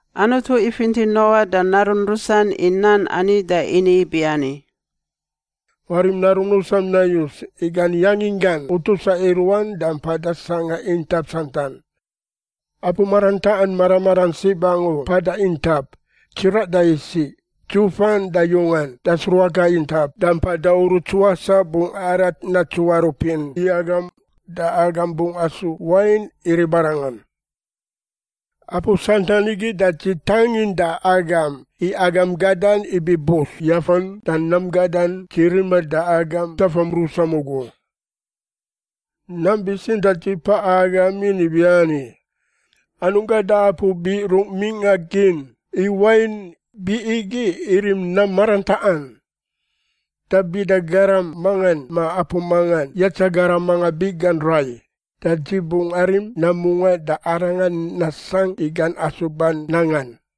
Anutu ifinti Noa da narun rusan i nan ani da ini ibiani, “Warim narum rusam nayus, i gan yanginggan utusa i ruan da mpada sangꞌa intap santan. Apu marantaꞌan mara maran sib angu mpada intap, tsiraꞌ da isiꞌ, dzufan da yungan da sruaka intap da mpada uruts wasaꞌ bungꞌ arat natsuarupin i agam da agam bungꞌ asu wain i ribarangan. Apu santan igi da dzi tangin da agam i agam gadan ibi bus yafan da nam gadan dzi riman da agam tafam rusam ugu. Nam bitsintaꞌ dzi paꞌa agamin ibiani: anungꞌ gada apu biꞌ rungꞌ mingꞌa gin, i wain biꞌ igi irim nam marantaꞌan. Da bida garam mangan ma apu mangan yatsa garam manga biꞌgan rai, da dzi bungꞌ arim nam mungaꞌ da arangan nasangꞌ i gan asuban nangan.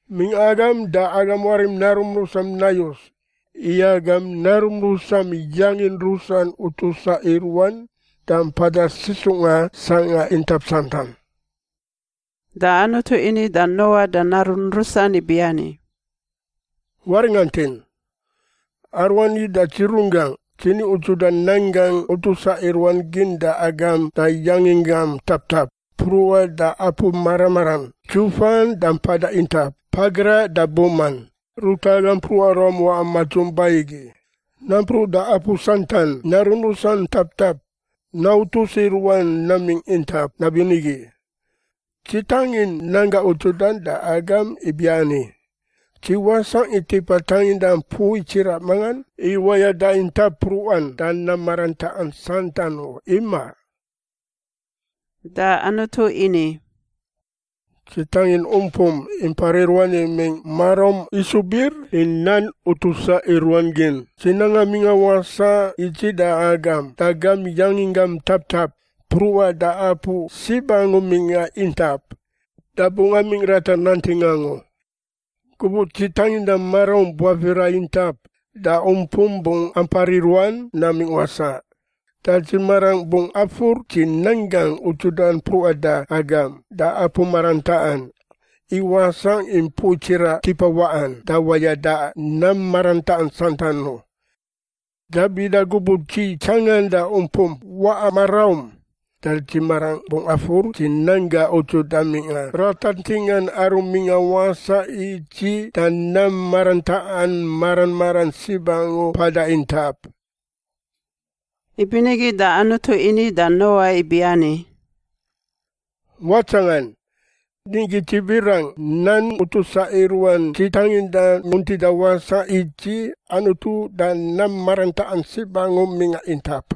“Mingꞌa agam da agam warim narum rusam nayus, i agam narum rusam yangin rusan utusa i ruan da mpada sisungꞌa sangꞌa intap santan.” Da Anutu ini da Noa da narun rusan ibiani, “Waringantin! Aruani da dzi runggangꞌ dzi ni udzuda nan gangꞌ utusa i ruan gin da agam da yanginggam taptap mpruꞌan da apu mara maran, dzufan da mpada intap, pagraꞌ da buman, ruta agam mpruꞌa ruam waꞌa madzung ba igi, nampruꞌ da apu santan narun rusan taptap nautus i ruan namingꞌ intap nabinigi. Dzi tangin nan gangꞌ udzudan da agam ibiani: Dzi wasangꞌ i tipa tanginda mpui tsiraꞌ mangan i wayada intap mpruꞌan da nam marantaꞌan santan u, imaꞌ.” Da Anutu ini, “Dzi tangin umpum impar i ruan imingꞌ maraum isu bir i nan utusa i ruan gin, dzi nanga mingꞌa wasaꞌ i dzi da agam da gam yanginggam taptap, mpruꞌa da apu sib angu mingꞌa intap, da bungꞌ amingꞌ ratar nanting angu. Gubuꞌ dzi tanginda maraum buafira intap da umpum bungꞌ ampar i ruan namingꞌ wasaꞌ, da dzi marangꞌ bungꞌ afur dzi nan gangꞌ udzudan mpruꞌan da agam da apu marantaꞌan, i wasangꞌ i mpui tsiraꞌ tipa waꞌan da wayada nam marantaꞌan santan u. Da bida gubuꞌ dzi tsanganda umpum waꞌa maraum da dzi marangꞌ bungꞌ afur dzi nan gangꞌ udzudan mingꞌa ratar tingan aru mingꞌa wasaꞌ i dzi da nam marantaꞌan mara maran sib angu mpada intap.” Ibinigi da Anutu ini da Noa ibiani, “Watsangan! Nigi Dzi birangꞌ nan utusa i ruan dzi tanginda muntida wasaꞌ i dzi Anutu da nam marantaꞌan sib angu mingꞌa intap.”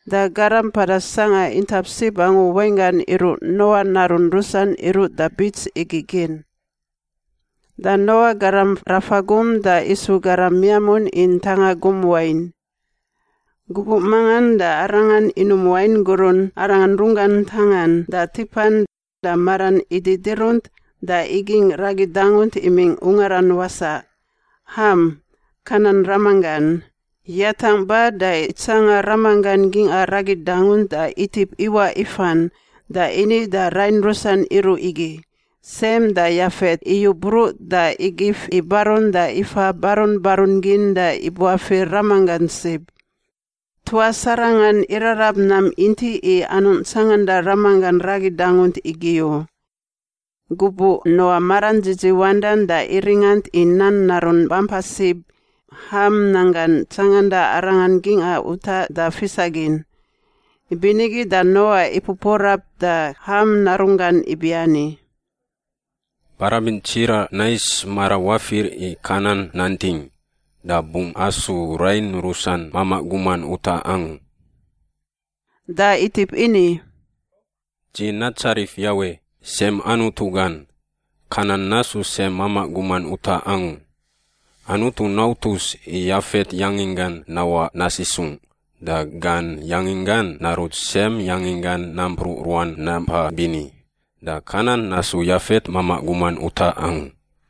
Da garam mpada sangꞌa intap sib angu wainggan iruꞌ Noa narun rusan iruꞌ da bits igi gin. Da Noa garam rafa gum da isu garam miamun i ntanga gum wain. Gubuꞌ mangan da arangan inum wain gurun arangan runggan ntangan da tipan da maran ididirunt da igingꞌ ragi dangunt imingꞌ ungaran wasaꞌ. Ham, Kanan ramanggan, yatangꞌ ba da itsanga ramanggan gingꞌa ragi dangunt da itip iwaꞌ ifan da ini da rain rusan iruꞌ igi. Sem da Yafet iyu bruꞌ da igif i barun da ifa barun barun gin da ibuafir ramanggan sib. Tuas arangan irarab nam intiꞌ i anungꞌ tsanganda ramanggan ragi dangunt igi u. Gubuꞌ Noa maran dzidziwandan da iringant i nan narun bampa sib, Ham, nanggan tsanganda arangan gingꞌa utaꞌ da fisagin. Ibinigi da Noa ipupuarap da Ham narunggan ibiani, “Barabin tsiraꞌ nais mara wafir i Kanan nanting. Da bungꞌ asu rain rusan mamaꞌ guman utaꞌ angu.” Da itip ini, “Dzi natsarif Yawe, Sem Anutu gan. Kanan nasu Sem mamaꞌ guman utaꞌ angu. Anutu nautus i Yafet yanginggan nawaꞌ nasisungꞌ da gan yanginggan narut Sem yanginggan nampruꞌ ruan nampa bini, da Kanan nasu Yafet mamaꞌ guman utaꞌ angu.”